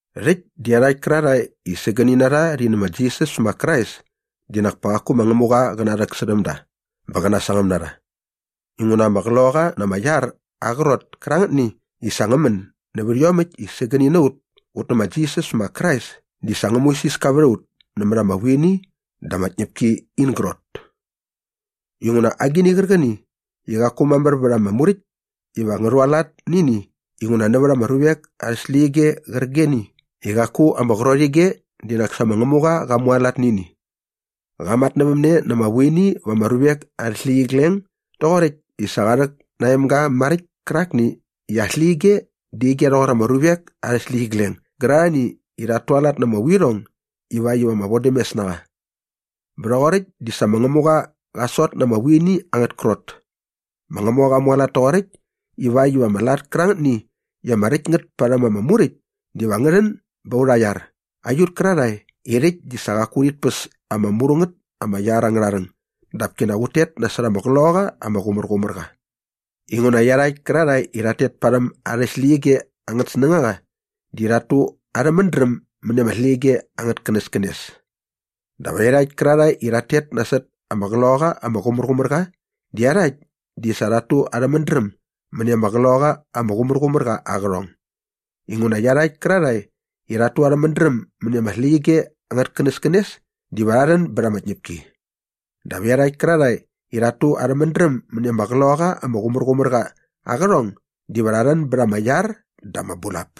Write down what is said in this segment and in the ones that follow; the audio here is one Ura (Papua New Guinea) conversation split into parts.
Rhäkt di iarhakt kärarhae i sägäni na rha rhi nä ma Jisas ma Krais di nak pa qaku ma Ngämuqa qä narhäksärhäm da bä qä nasangäm na rha inguna ama Qloqaqa na ama iar aa qrot kärangätni i sa ngä män nävät iomäkt i sägäni na ut ut nä ma Jisas ma Krais di sa ngä muisiska vät a ut nämät ama vuini dä ama tñäpki in grot. Inguna agini qärqäni i qaku mamär vät ama Muräkt iva ngä rhualat nä ini inguna nävät ama ruvek arhä släqyige qärqigeni i qaku ama qrot ige di nak sa ma Ngämuqa qa mualat nä ini. Qa matnävämne na ama vuini va ama ruvek arhä släqyigleng doqoräkt i sa qa rhäk na aa emga maräkt kärakni i aa släqyige di ige rhoqor ama ruvek arhä släqyigleng gärarhani i rhat tualat na ama vuirhong ivakt iva ama vodämes na qa. Bä rhoqoräkt di sa ma Ngämuqa qa sot na ama vuini angät krot. Ma Ngämuqa qa mualat toqoräkt iväkt iva ama lat kärangätni i ama räkt ngät parhäm ama Muräkt diva ngä rhän bät aurha iar aiut kärarhae i rhäkt di sa qaku urhit päs ama mru ngät ama iar angärha rhäng dap kinak ut tet nasot ama Qloqaqa ama Qumärqumärqa. Inguna iarhakt kärarhae i rhat tet parhäm arhä släqyige angät snängaqa di rhat tu arhä mädräm mäni ama släqyige angät känäskänes. Dap iarhakt kärarhae i rhat tet nasot ama Qloqaqa ama Qumärqumärqa di iarhakt di sa rhat tu arhä mädräm mäni ama Qloqaqa ama Qumärqumärqa aa qärhong. Inguna iarhakt kärarhae i rhat tu arhä mädräm mäni ama släqyige angät känäskänes diva rha rhän bät ama tñäpki. Dap iarhakt kärarhae i rhat tu arhä mädräm mäni ama Qloqaqa ama Qumärqumärqa aa qärhong diva rha rhän bät ama iar dä ama bulap.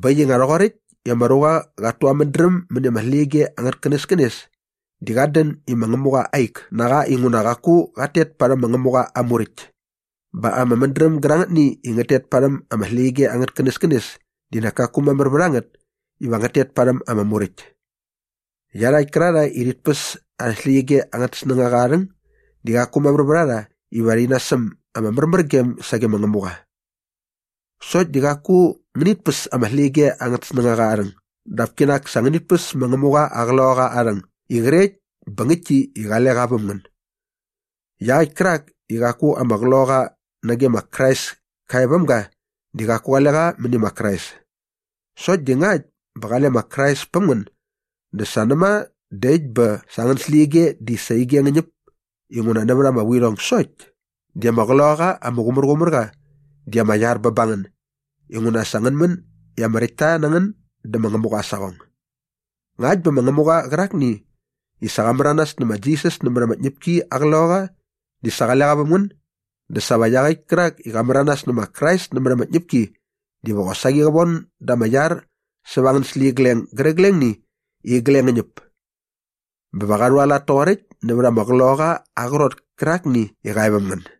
Bä äkt i nga rhoqoräkt i ama ruqa qat tu aa mädräm mäni ama släqyige angät känäskänes di qat dän i ma Ngämuqa aa ik na qa inguna qaku ngät tet parhäm ma Ngämuqa aa Muräkt. Bä ama mädräm gärangätni i ngät tet parhäm ama släqyige angät känäskänes di nak kaku mamär vät a ngät iva ngät tet parhäm ama Muräkt. Iarhakt kärarhae i rhit päs arhä släqyige angät snängaqa aa rhäng di qaku mamär vät a rha iva rhi nasäm ama märmärgem sage ma Ngämuqa. Sokt di qaku ngänit päs ama släqyige angät snängaqa aa rhäng dap kinak sa ngänit päs ma Ngämuqa aa Qloqaqa aa rhäng i qrekt bä ngäktki i qale qa väm ngän. Iaqäkt kärak i qaku ama Qloqaqa nage ma Krais ka e väm ga di qaku qale qa mäni ma Krais. Sokt di ngakt bä qale ma Krais päm ngän dä sa näma dä äkt bä sa angän släqyige di sa ige ngä ñäp inguna nävät ama vuirhong sokt di ama Qloqaqa ama Qumärqumärqa di ama iar bä ba ngän inguna sa ngän män i ama räktta na ngän dä ma Ngämuqa aa saqong. Ngakt bä ma Ngämuqa qärakni i sa qa märanas nä ma Jisas nämät ama tñäpki aa Qloqaqa di sa qale qa väm ngän dä sa va iaqäkt kärak i qa märanas nä ma Krais nämät ama tñäpki diva qosaqi qä von da ama iar säva angän släqyigleng gärqiglengni i igleng ngä ñäp. Bä va qa rhualat toqoräkt nävät aa Qloqaqa aa qrot kärakni i qa e väm ngän.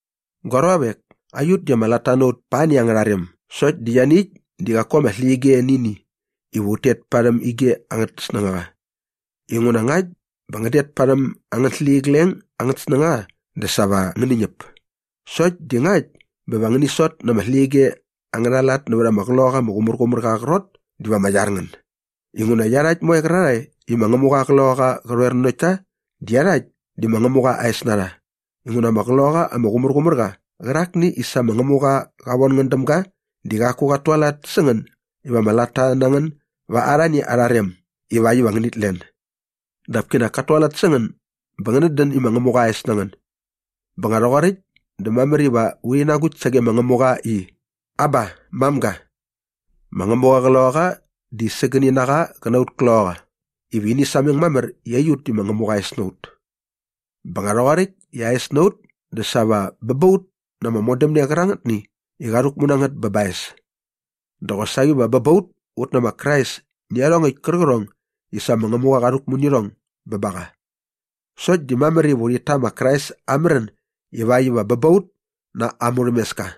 Gua ruavek, aiut di ama latta na ut pa ani angärha rem sokt di ianiäkt di qaku ama släqyige nä ini iva ut tet parhäm ige angät snängaqa inguna ngakt bä ngän det parhäm angän släqyigleng angät snängaqa dä sa va ngäni ñäp. Sokt di ngakt bä va ngäni sot na ama släqyige angärha lat nävät ama Qloqaqa ama Qumärqumärqa aa qrot diva ama iar ngän. Inguna iarhakt moe qärarhae i ma Ngämuqa aa Qloqaqa qä rhoer nanokt ta di iarhakt di ma Ngämuqa aa es na rha inguna ama Qloqaqa ama Qumärqumärqa qärakni i sa ma Ngämuqa qa von ngän däm ga di qaku qat tualat sä ngän iva ama latta na ngän ba arhani arha rem ivakt iva ngänit len. Dap kinak kat tualat sä ngän bä ngänät dän i ma Ngämuqa aa es na ngän. Bä nga rhoqoräkt dä mamär iva urhi nagukt sage ma Ngämuqa i, “Aba, mamga.” Ma Ngämuqa aa Qloqaqa di sägäni na qa qä na aut kloqaqa iva ini sameng mamär i aiut di ma Ngämuqa aa es na ut. Bä nga rhoqoräkt i aa es na ut dä sa va bä ba ut na ama modämne qärangätni i qa rhäkmu na ngät bä ba aa es. Dä qosaqi va bä ba ut ut nä ma Krais nä iarhongäkt kärqärhong i sa ma Ngämuqa qa rhäkmu nä irhong bä ba qa. Sokt di mamär iva urhit ta ma Krais aa märän ivakt iva bä ba ut na aa murhämeska.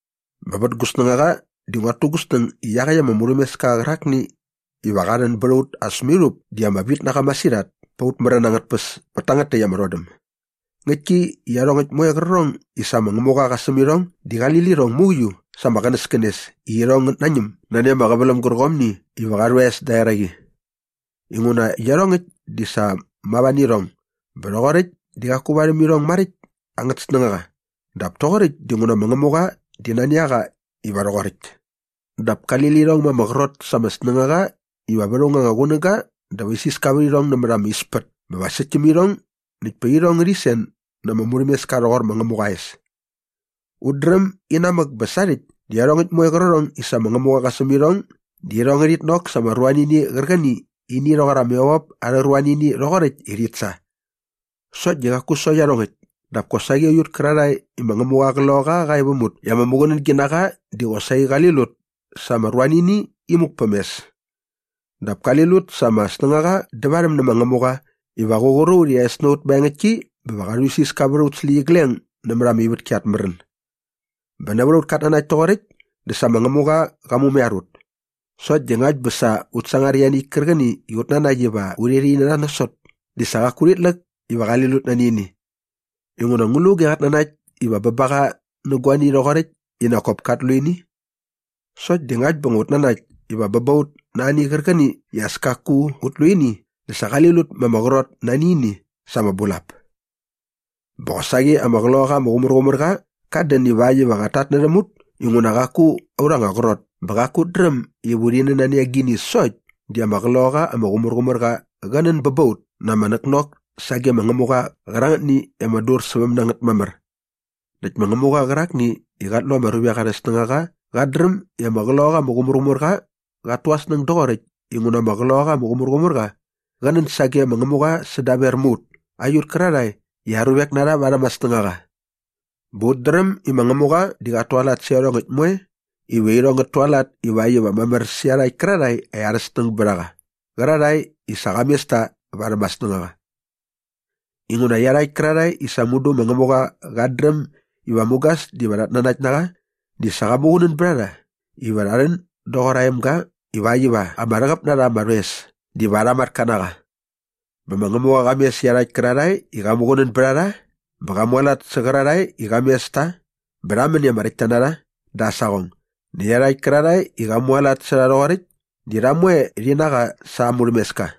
Bä vät gu snängaqa di nguat tu gu snäng i iaqäkt ama murhämeska qärakni iva qa rhän bät a ut as mirhup di ama vit na qa masirhat pät aut märän angät tpäs pät tangät täkt ama rhodäm. Ngäktki i iarhongäkt moe qärqärhong i sa ma Ngämuqa qa säm irhong di qali lirhong mauiu sa ama qänäskänes i irhong ngät nañäm nani ama qäväläm gärqomni iva qa rhu aa es säda eraqi. Inguna iarhongäkt di sa mava nä irhong bä rhoqoräkt di qaku varhäm irhong maräkt angät snängaqa dap toqoräkt dinguna ma Ngämuqa di nani a qa iva rhoqoräkt. Dap kali lirhong ma ama qrot sa ama snängaqa iva vät aung anga qunäga dä va isiska vät irhong nämät ama ispät bä va säkt täm irhong näkt pa irhong ngärhi sen na ama murhämeska rhoqor ma Ngämuqa aa es. Ut dräm i inamäk bä sarhäkt di iarhongäkt moe qärqärhong i sa ma Ngämuqa qa säm irhong di irhong ngärhit nok sa ama ruanini qärqäni i ini rhoqor ama evop arhä ruanini rhoqoräkt i rhit sa. Sokt di qaku sokt iarhongäkt dap kosaqi aiut kärarhae i ma Ngämuqa aa Qloqaqa qa e väm ut i ama muqunängi na qa di qosaqi qali lut sa ama ruanini imuk päm mes. Dap kali lut sa ama snängaqa dävarhäm nä ma Ngämuqa iva qä qur a ut i aa es na ut maengäktki bä va qa rhuisiska vät aut släqyigleng nämät ama ivätki at märän. Bä nävät aut katnanakt toqoräkt di sa ma Ngämuqa qa mumaiar ut. Sokt di ngakt bä sa ut sangar ianiäkt kärqäni i ut nanakt iva urhi rha ini nasot di sa qaku urhit läk iva qali lut nani ini. Inguna ngu lu auge qat nanakt iva bä ba qa nä guani rhoqoräkt i nak kop kat lu ini? Sokt di ngakt bä ut nanakt iva bä ba ut na ani qärqäni i as kaku ut lu ini dä sa qali lut ma ama qrot nani ini sa ama bulap. Bä qosaqi ama Qloqaqa ama Qumärqumärqa qat dän ivakt iva qat tatnärhäm ut inguna qaku urha anga qrot bä qaku ut dräm iva urhi nän di nani agini sokt di ama Qloqaqa ama Qumärqumärqa qä nän bä ba ut na ama näknok sage ma Ngämuqa qärangätni i ama dursäväm na ngät mamär. Näkt ma Ngämuqa qärakni i qat lu ama ruvek arhä snängaqa qat dräm i ama Qloqaqa ama Qumärqumärqa qat tu aa snäng doqoräkt inguna ama Qloqaqa ama Qumärqumärqa qä nän sage ma Ngämuqa sädaver mä ut aiut kärarhae i aa ruvek na rha varhäm aa snängaqa. Bä ut dräm i ma Ngämuqa di qat tualat sä iarhongäkt moe iva irhong ngät tualat ivakt iva mamär sä iarhakt kärarhae i arhä snäng bät a qa qärarhae i sa qa mes ta varhäm aa snängaqa. Inguna iarhakt kärarhae i sa mudu ma Ngämuqa qat dräm iva mugas diva rhat nanakt na qa di sa qa muqunän bät a rha iva rha rhän doqor aa emga ivakt iva ama rhäqäp na rha ama rhoes diva arha matka na qa. Bä ma Ngämuqa qa mes iarhakt kärarhae i qa muqunän bät a rha bä qa mualat sä qärarhae i qa mes ta bä rha män i ama räktta na rha da aa saqong näkt iarhakt kärarhae i qa mualat sä rha rhoqoräkt di rha moe rhi na qa sa aa murhämeska.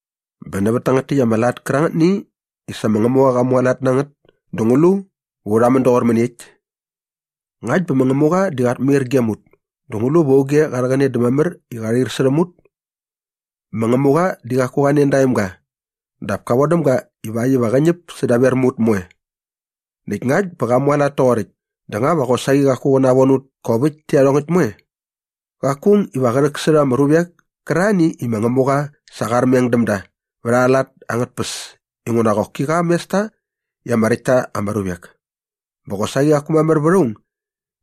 Bä nävät tangät täkt ama lat kärangätni i sa ma Ngämuqa qa mualat na ngät dä ngu lu va urha rhamän doqor mäniekt? Ngakt bä ma Ngämuqa di qat mair gem ut dä ngu lu va auge qa rhäqäne dä mamär i qa rhair särhäm ut? Ma Ngämuqa di qaku qa nen da aa emga dap ka vodäm ga ivakt iva qä ñäp sädaver mä ut moe. Näkt ngakt bä qa mualat toqoräkt dä nga va qosaqi qaku qä navon ut kop äkt tä iarhongäkt moe? Qaku aung iva qä rhäksärha ama ruvek kärarhani i ma Ngämuqa sa qa armeng däm da vät arha lat angät tpäs inguna qoki qa qa mes ta i ama räkt ta ama ruvek. Bä qosaqi qaku mamär vät aung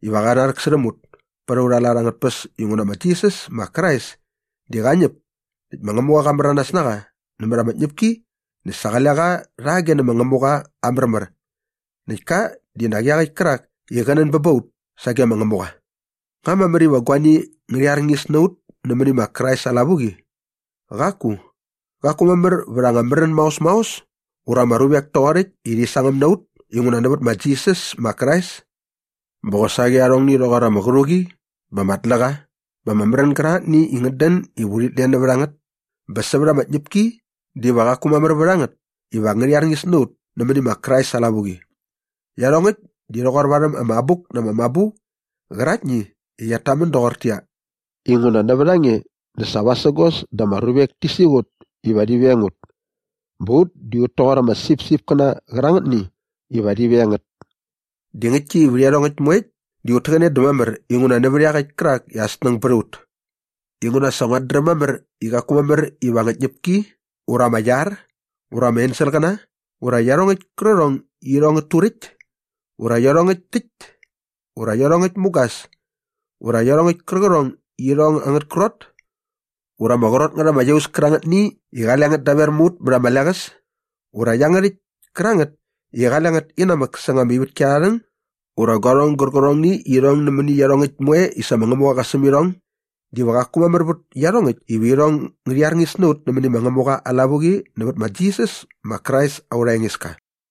iva qä narhäksärhäm ut pät aurha lat angät tpäs inguna ma Jisas ma Krais di qa ñäp näkt ma Ngämuqa qa märanas na qa nämät ama tñäpki näkt sa qale qa rhage dä ma Ngämuqa aa märmär näkt ka di nak iaqäkt kärak i qä nän bä ba ut sagem ma Ngämuqa. Nga mamär iva guani ngärhi arñis na ut nämäni ma Krais aa lavuqi? Qaku! Qaku mamär vät ama märän maos maos ura ama ruvek toqoräkt i rhi sangäm na ut inguna nävät ma Jisas ma Krais. Bä qosaqi arhongni rhoqor ama qärhuqi bä ama tläqa bä ama märän gärangätni i ngät dän iva sa urhit len nävät a ngät bä sävät ama tñäpki diva qaku mamär vät a ngät iva ngärhi arñis na ut nämäni ma Krais aa lavuqi. Iarhongäkt di rhoqor varhäm ama Abuk na ama Mabu qäraktni i qiat tamän doqortäqyia, “Inguna nävät a nge dä sa vasägos dä ama ruvek ti siqut iva rhi veng ut. Bä ut di ut toqor ama sipsipkäna qärangätni iva rhi veng ngät.” Di ngäktki i vät iarhongäkt moekt di ut täqäne dä mamär inguna nävät iaqäkt kärak i aa snäng bät a ut. Inguna sa nguat dräm mamär i qaku mamär iva ama tñäpki ura ama iar ura ama enselqäna ura iarhongäkt kärqärhong i irhong ngät turäkt ura iarhongäkt täkt ura iarhongäkt mugas ura iarhongäkt kärqärhong i irhong angät krot ura ama qrot ngät ama iaus kärangätni i qale ngät daver mä ut mät ama leqäs ura iangärhäkt kärangät i qale ngät inamäk säng ama ivätki arha rhäng ura guarhong gärqärhongni i irhong nämäni iarhongäkt moe i sa ma Ngämuqa qa säm irhong diva qaku mamär vät iarhongäkt iva irhong ngärhi arñis na ut nämäni ma Ngämuqa aa lavuqi nävät ma Jisas ma Krais aurha Engeska.